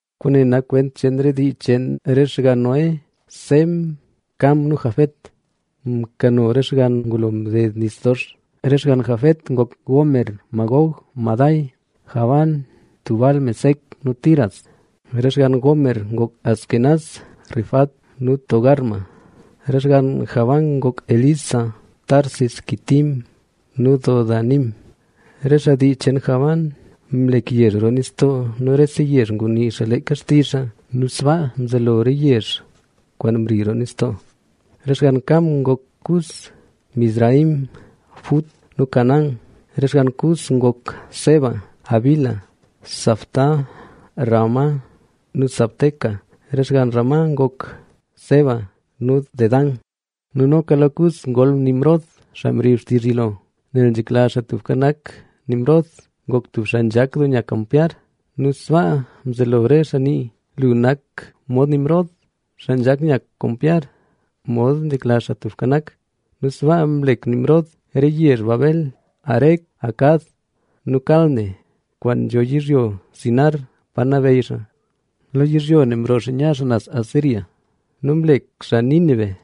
Kwaane nak kwent cheen re dii cheen re xgann Noé. Sem, Cam nu Jafet mkano re xgann ngulo mded nis dox. Re xgann Jafet ngok: Gomer, Magog, Madai, Javán, Tubal, Mesec nu Tiras. Re xgann Gomer ngok: Askenaz, Rifat nu Togarma. Re xgann Javán ngok: Elisa, Tarsis, Quitim nu Dodanim. Re xaa dii cheen Javán mlek yezh roo nistoo nu rese yezh ngunii xaa leeka xtizh xaa nu sbaa mzelo re yezh kwaan mri roo nistoo. Re xgann Cam ngok: Cus, Mizraim, Fut nu Canaán. Re xgann Cus ngok: Seba, Havila, Sabta, Raama nu Sabteca. Re xgann Raama ngok: Seba nu Dedán. Nu noka lo Cus ngol Nimrod, xaa mrib xtizh yilo. Nel nzhekla Xaa Tubka Nak, Nimrod ngok tub xaa nzhak doo nya kampyar. Nu sbaa mzelo re xaa nii: “Lu nak mod Nimrod, xaa nzhak nya kampyar mod nzhekla Xaa Tubka Nak”. Nu sbaa mlek Nimrod re yezh Babel, Erec, Acad nu Calne, kwaan nzho yizhyo Sinar, pa nabeyy xaa. Lo yizhyo ne mroo xaa nya xaa naz Asiria nu mlek xaa Nínive,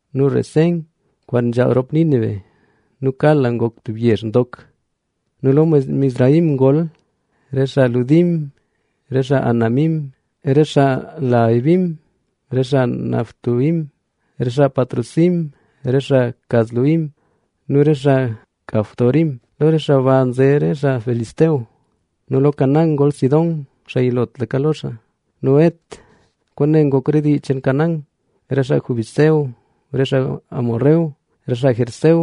nu Resén kwaan nzhaal rop Nínive nu Cala ngok tub yezh ndok. Nu lo Mizraim ngol: re xaa Ludim, re xaa Anamim, re xaa Lehabim, re xaa Naftuhim, re xaa Patrusim, re xaa Casluhim nu re xaa Caftorim. Lo re xaa ba nze re xaa Filistea. Nu lo Canaán ngol: Sidón, xaa yilotlaka lo xaa nu Het. Kwaane ngok re dii cheen Canaán: re xaa Jebús, re xaa Hesbón, re xaa Gergeseo,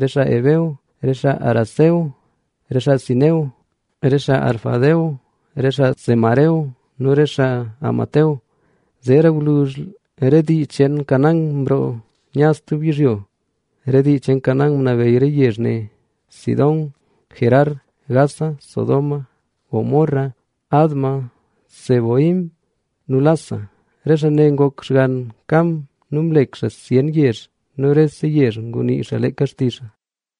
re xaa Heveo, re xaa Araceo, re xaa Sineo, re xaa Arvadeo, re xaa Zemareo nu re xaa Hamateo. Zeera gwluzh re dii cheen Canaán mroo nya stub yizhyo. Re dii cheen Canaán ngunabeyy re yezh ne: Sidón, Gerar, Gaza, Sodoma, Gomorra, Adma, Zeboim nu Lasa. Re xaa ne ngok xgann Cam nu mlek xaa zyen yezh nu rese yezh ngunii xaa leeka xtizh xaa.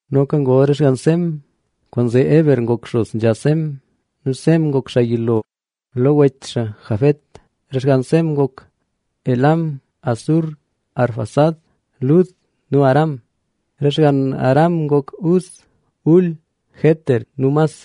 Noka ngol re xgann Sem. Kwaanzee Heber ngok xos nzha Sem. Nu Sem ngok xaa yilo lo wech xaa Jafet. Re xgann Sem ngok: Elam, Asur, Arfaxad, Lud nu Aram. Re xgann Aram ngok: Uz, Hul, Geter nu Mas.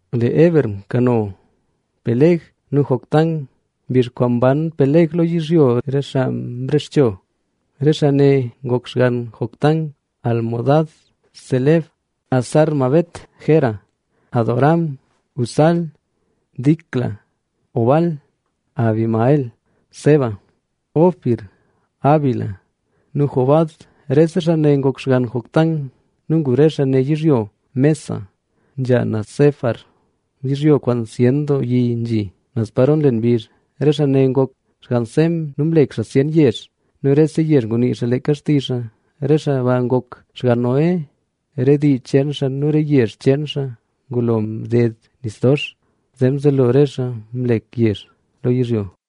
Lee Heber mkano Pelega nu Joctán. Mbizh kwaan mban Peleg lo yizhyo, re xaa mrexcho. Re xaa ne ngok xgann Joctán: Almodad, Selef, Hazar-mavet, Jera, Adoram, Uzal, Dicla, Obal, Abimael, Seba, Ofir, Havila nu Jobab. Rese xaa ne ngok xgann Joctán. Nu ngu re xaa ne yizhyo Mesa, nzha naz Sefar, yizhyo kwaan zyen doo yi nzhi, naz paro nlen mbizh. Re xaa ne ngok xgann Sem nu mlek xaa zyen yezh nu rese yezh ngunii xaa leeka xtizh xaa. Re xaa ba ngok xgann Noé, re dii cheen xaa nu re yezh cheen xaa ngulo mded nis dox, zee mzelo re xaa mlek yezh lo yizhyo.